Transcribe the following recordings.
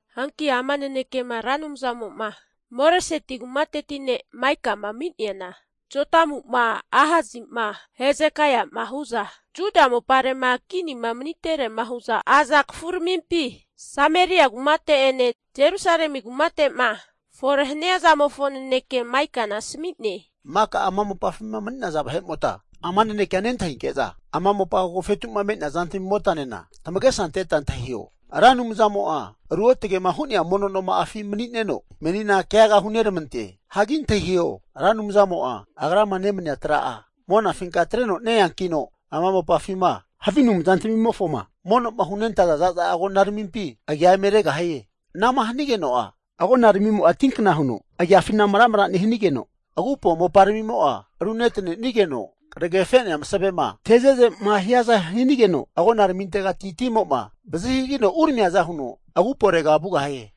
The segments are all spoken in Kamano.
Hanki ama nanekea Ra Anumzamo'ma, Moreseti kumateti ne' Maikama ami'neana, Jotamu'ma, Ahasi'ma, Hezekaia'ma hu'za Juda mopare'ma kinima maniterema hu'za aza kafu ramimpi Sameria kumate'ene Jerusalemi kumate'ma fore hania zamofo naneke Maikana asmi'ne. Maka ama mopafima mani'naza vahe'mota ama nanekea nentahinke'za, Ama mopa agofetu'ma me'nea zantami motanena tamagesa ante'neta antahiho. Ra Anumzamo'a ruotage'ma hu'nea mono moma'afi mani'neno, menina keaga huneramante. Hagi antahiho! Ra Anumzamo'a agrama nemania tra'a monafinka atreno ne-eankino ama mopafima havi anumzantamimofoma mono'ma hunentaza za'za agonaramimpi agia eme regahie. Ana'ma hanigeno'a agonaramimo'a tinkna huno agiafina maramara nehanigeno, agupo moparamimo'a runetanenigeno, kragefe'nea masavema teze'zema hiaza hanigeno, agonaramintegati timo'ma vazi hagagino uramiaza huno aguporega vugahie.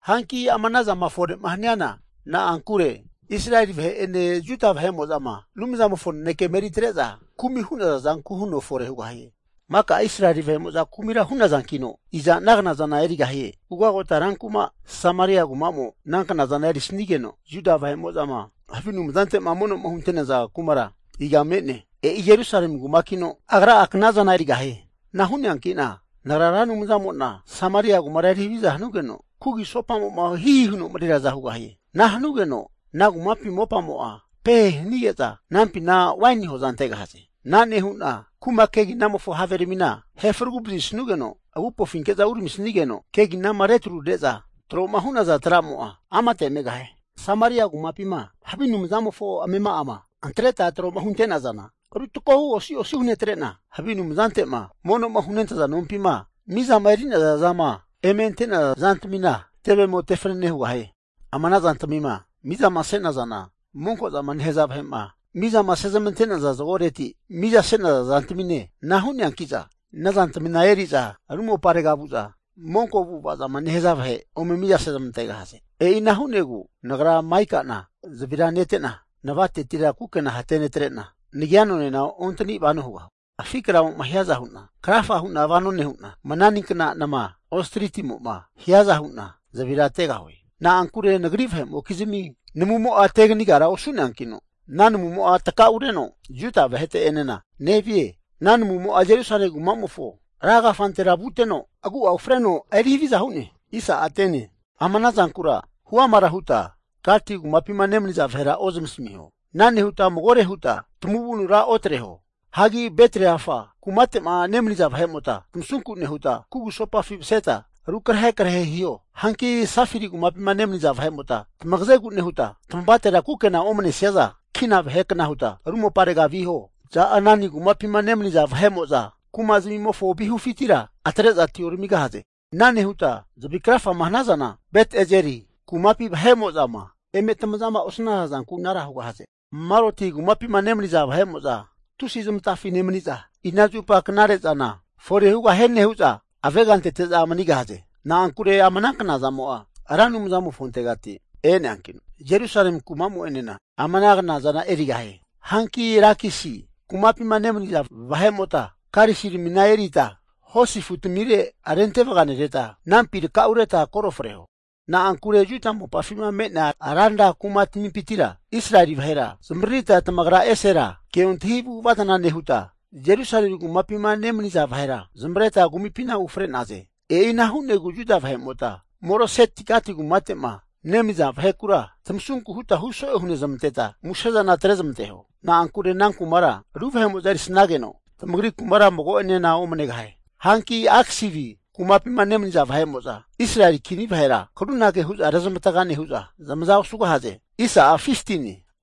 Hanki ama ana zama fore'ma haniana na'ankure, Israeli vahe'ene Juda vahe'mo'zama Anumzamofo nanekema eri tre'za kumi'ma hu'naza zanku huno fore hugahie. Maka Israeli vahe'mo'za kumira hu'nazankino, iza ana knazana erigahie? Ugagota ran kuma Sameria kuma'mo ana knazana erisanigeno, Juda vahe'mo'zama havi anumzante'ma mono'ma hunentaza kumara iga me'ne? E'i Jerusalemi kumakino agra'a knazana erigahie. Ana hu'neanki'na nagra Ra Anumzamo'na Sameria kumara eri haviza hanugeno kugusopamo'ma hihi huno mareriaza hugahie. Ana hanugeno ana kumapi mopamo'a pehe hanige'za anampina waini hoza antegahaze. Ana nehu'na kuma keginamofo have ramina ahefaragu vazisanugeno agupofinke'za uramisigeno, keginama retrure'za tro'ma hu'naza tramo'a amate megahie. Samaria kumapima havi anumzamofo amema'ama antreta tro'ma hunte'nazana ru takohu osi osi hunetre'na, havi anumzante'ma mono'ma hunentaza nompima, mizama eri'naza zama eme ante'naza zantamina tevemo tefanane hugahie. Ama ana zantamima mizama se'nazana, monko zama nehaza vahe'ma miza sezamante'naza zagoreti miza se'naza zantamine. Ana hu'neanki'za ana zantamina eri'za ru moparega vu'za monko avu'ava zama nehaza vahe ome mizase zamantegahaze. E'ina hu'negu nagra Maika'na tusi nasunku hu'na zavira nete'na, navatetira kukena hate netre'na nagia nonena ontani vano hugahue. Afi kramo'ma hiaza hu'na krafa huna vano nehu'na, mananinkna nama, ostritsimo'ma hiaza hu'na zavira tegahue. Na'ankure nagri vahemokizmi namumo'a teganigara osu'neankino, ana namumo'a takaureno Juda vahete'enena nevie. Ana namumo'a Jerusalemi kumamofo rankafantera vuteno, agu'a ufreno eri haviza hu'ne. Ama ana zankura huamara huta Gati kumapima nemaniza vahera ozamasamiho. Ana nehuta magore huta tamavunura otreho. Hagi Bet-Leafra kumate'ma nemaniza vahemota tamasunku nehuta, kugusopafi maseta rukrahe krahe hiho. Hanki Safiri kumapima nemaniza vahe'mota, tamagazegu nehuta tamavatera kukena omanesiaza kina vahe kna huta ru moparega viho. Za'anani kumapima nemaniza vahe'mo'za kuma zamimofo vihufintira atre'za atioramigahaze. Ana nehuta zavi krafama hanazana Bet-Ezeli kumapi vahe'mo'zama eme tamazama osnaza zanku anara hugahaze. Maroti kumapima nemaniza vahe'mo'za tusi zamatafi nemani'za, ina zupa knare zana fore hugahie nehu'za avega antete'za manigahaze. Na'ankure ama ana knazamo'a Ra Anumza mofontegati e'neankino, Jerusalemi kumamo'enena ama ana knazana erigahie. Hanki Lakisi kumapima nemaniza vahe'mota karisiramina erita hosi afutamire rente vaganereta, anampi takaureta koro freho. Na'ankure Juda mopafima me'nea ranra kuma tamimpintira Israeli vahera zamavaririta tamagra esera keontahi avu'ava zana nehuta, Jerusalemi kumapima nemaniza vahera zamavareta kumipina ufre'naze. E'ina hu'negu Juda vahemota, Moreset-Gati kumate'ma nemaniza vahekura tamasunku huta huso'e hunezamanteta musezana tre zamanteho. Na'ankure ana kumara ru vahe'mo'za erisanageno tamagri kumara mago'enena omanegahie. Hanki Aksibi kumapima nemaniza vahe'mo'za Israeli kini vahera karunage hu'za rezamavataga nehu'za zamaza osugahaze.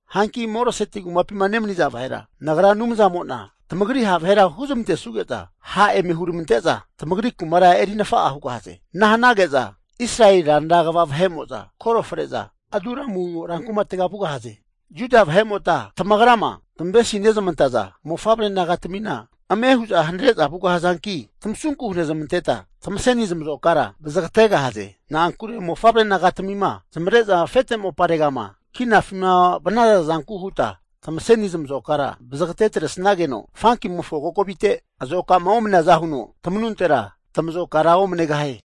Hanki Moreseti kumapima nemaniza vahera, Nagra Anumzamo'na tamagri ha' vahera huzmantesuge'za e'za, ha' eme huramante'za tamagri kumara eri nafa'a hugahaze. Ana hanage'za Israeli ranra kva vahe'mo'za koro fre'za Adulamu ran kumatega vugahaze. Juda vahe'mota tamagrama tamavesi nezamantaza mofavre nagatamina, ame hu'za hanare'za vugahazanki tamasunku hunezamanteta tamaseni tamazokara vazagategahaze. Na'ankure mofavre nagatamima zamavare'za afete moparegama kinafima vanaza zanku huta tamaseni tamazokara vazagate atresageno fankimofo kokovite azoka'ma omaneaza huno tamanuntera tamazokara omanegahie.